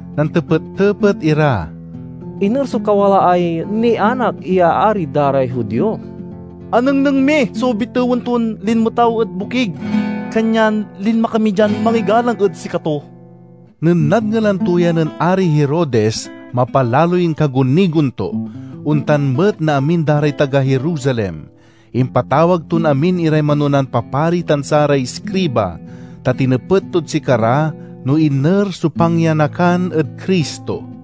Nantepet-tepet ira, "Iner so kawalaay nianak ya ari da ray Judio? Anengneng mi so bitewen ton linmetaw ed bokig, kanyan linma kami dian mangigalang ed sikato." Nen nadngelan to ya nen Ari Herodes mapalaloy inkagunigon to; ontan met na amin da ray taga Jerusalem. Impatawag ton amin iray manonan papari tan saray iskriba, ta tinepet tod sikara no iner so pangyanakan ed Cristo.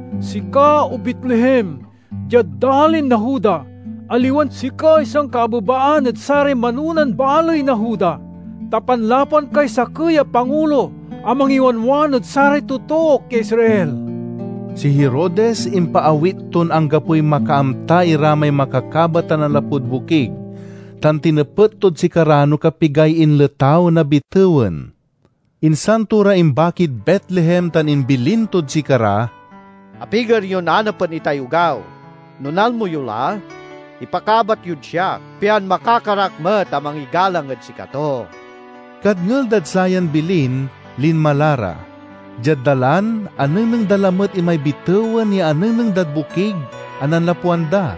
'Sika, O Betlehem, diad dalin na Juda, aliwan sikay sankaabebaan ed saray manonan baley na Juda; ta panlapwan kay sakey a pangulo a mangiwanwan ed saray totook ya Israel.'" Si Herodes impaawit ton anggapoy makaamta ira may makakabat a nanlapud Bokig, tan tinepet tod sikara no kapigay inletaw na bitewen. Insan to ra imbakid Betlehem tan imbilin tod sika ra, "Apiger yon anapen itay ogaw. No nalmo yo la, ipakabat yod siak, pian makakar ak met a mangigalang ed sikato." Kadngel dad sayan bilin, linma la ra. Diad dalan, anengneng da lamet imay bitewen ya anengneng dad bokig a nanlapwan da.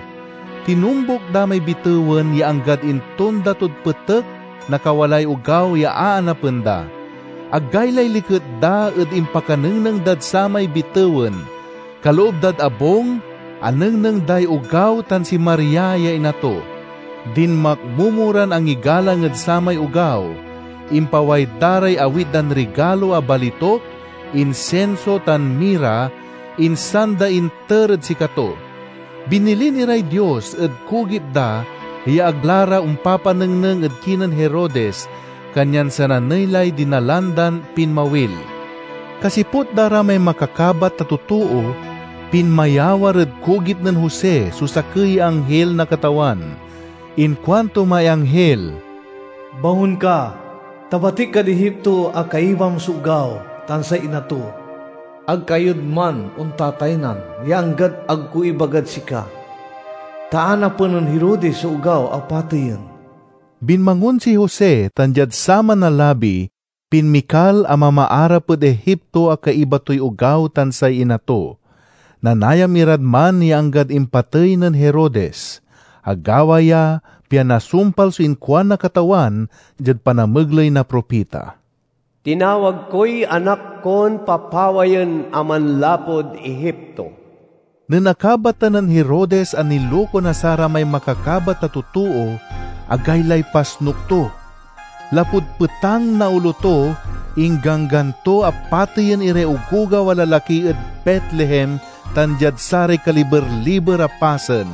Tinombuk da may bitewen ya anggad intonda tod petek na kawalaay ogaw ya aanapen da. Agaylay liket da ed impakanengneng dad samay bitewen! Kaloob dad abung anengneng day ogaw tan si Maria ya ina to. Dinmakmomo ran angigalang ed samay ogaw. Impaway da ray awit dan rigalo a balituk, insinso, tan mira, insan da inter ed sikato. Binilin iray Dios ed kugip da ya ag la ra ompapanengneng ed kinen Herodes, kanyan sananey lay dinalan dan pinmawil. Kasiput da ray may makakabat a totoo, pinmayawar ed kugip nen Jose so sakey ya anghil na Katawan. Inkuanto may anghil, "Bangon ka, ta batik kad Egipto a kaibam so ogaw tan say ina to. Ag kayod man ontataynan ya anggad ag ko ibagad sika, ta anapen nen Herodes so ogaw a pateyen." Binmangon si Jose tan diad saman a labi, pinmikal a mamaarap ed Egipto a kaiba toy ogaw tan say ina to. Nanayam irad man ya anggad impatey nen Herodes. Agawa ya pian nasumpal so inkuan na Katawan diad panamegley na propita, "Tinawag koy Anak kon papawayen a manlapud Egipto." Nen akabatan nen Herodes a niluko na saramay makakabat a totoo, agaylay pasnuk to. Lapud petang na olo to, ingganggan to a pateyen iray ogogaw a lalaki ed Betlehem tan diad saray kaliber-liber a pasen.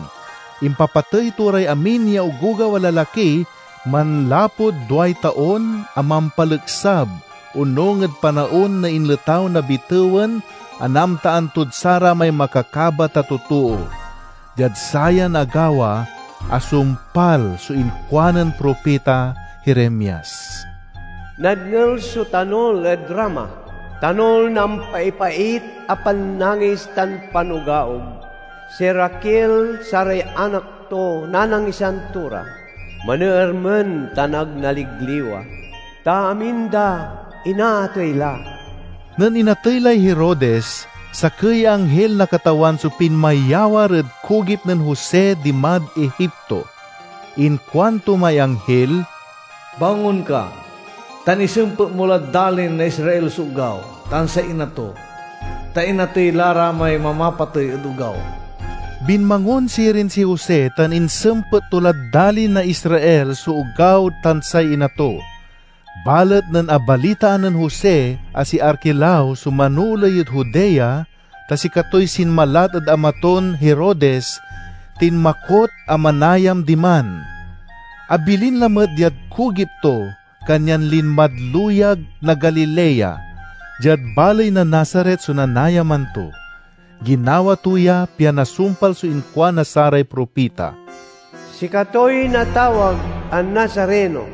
Impapatey to ray amin ya ogogaw a lalaki, manlapud duay taon a mampaleksab, onung ed panaon na inletaw na bitewen a naamtaan tod saramay makakabat a totoo. Diad sayan agawa, asumpal so inkuanen propita Jeremias: "Nadngel so tanul ed Rama— tanul na ampaipait a pannangis tan panugaog. si Raquel saray anak to nanangisan to ra; maneermen tan ag naligliwa, ta amin da inaatey la." Nen inatey lay Herodes, sakey ya anghil na Katawan so pinmayawar ed kugip nen Jose dimad Egipto. Inkuanto may anghil, "Bangon ka tan isempet mo lad dalin na Israel so ogaw tan say ina to, ta inatey la ra may mamapatey ed ogaw." Binmangon sirin si Jose tan insempet to lad dalin na Israel so ogaw tan say ina to. Balet nen abalitaan nen Jose a si Arquelao so manooley ed Judea, ta sikatoy sinmalat ed ama ton Herodes, tinmakot a manayan diman. Abilin lamet diad kugip to, kanyan linmad luyag na Galilea. Diad baley na Nazaret so nanayaman to. Ginawa to ya pian nasumpal so inkuan na saray propita, "Sikatoy natawag a Nazareno."